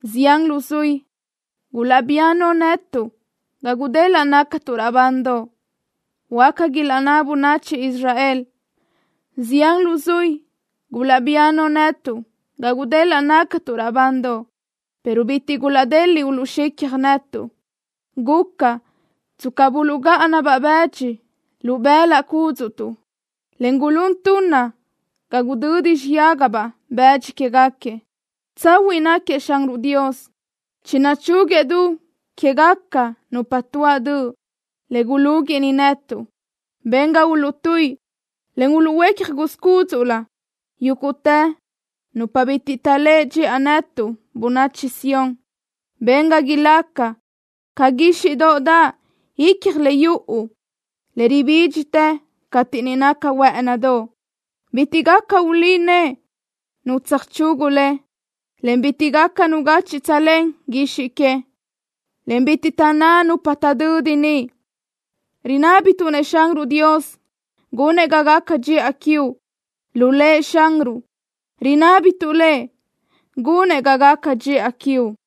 “Zian luzuí gulaʼbía no netuʼ ga gudelaʼ nácatuʼ raʼbandoʼ”, huáca ilaʼnná bönachi Israel: “Zian luzuí gulaʼbía no netuʼ ga gudelaʼ nácatuʼ raʼbandoʼ, pero bitiʼ gulaʼdeliʼ uluʼxicja netuʼ. Guca tsca buluʼgáʼana-baʼ bëdxi lu bëlaʼ cúdzuʼtuʼ, en gulún tunna ga gudödi xiyágabaʼ bëdxi quégaquiëʼ.” Tsahuiʼ náquiëʼ Xanruʼ Dios. Chinachúguëʼ du quégaca nupa tuáʼ döʼ le gulúguiʼni netuʼ. Ben ga uluʼtuíʼi, en uluʼhuécja guz cúdzuʼlö yúguʼtë nupa bitiʼ taʼléʼe dxiʼa netuʼ, bönachi Sión. Ben ga ilácagaca ca guíxiʼdoʼ daʼ ícjoʼolö yuʼu, le ribídxitë cateʼ niʼ naca huë́ʼënidoʼ. Bitiʼ gaca ulí nëʼe nu tsöjchugu le, en bitiʼ gaca nu gachi tsölén guizxi que, en bitiʼ taʼnná nupa taʼdödi niʼ: “Rinábituʼ-nëʼ Xanruʼ Dios gunëʼ ga gaca dxiʼa quiuʼ. Lu Lëʼ Xanruʼ rinábituʼ Lëʼ gunëʼ ga gaca dxiʼa quiuʼ.”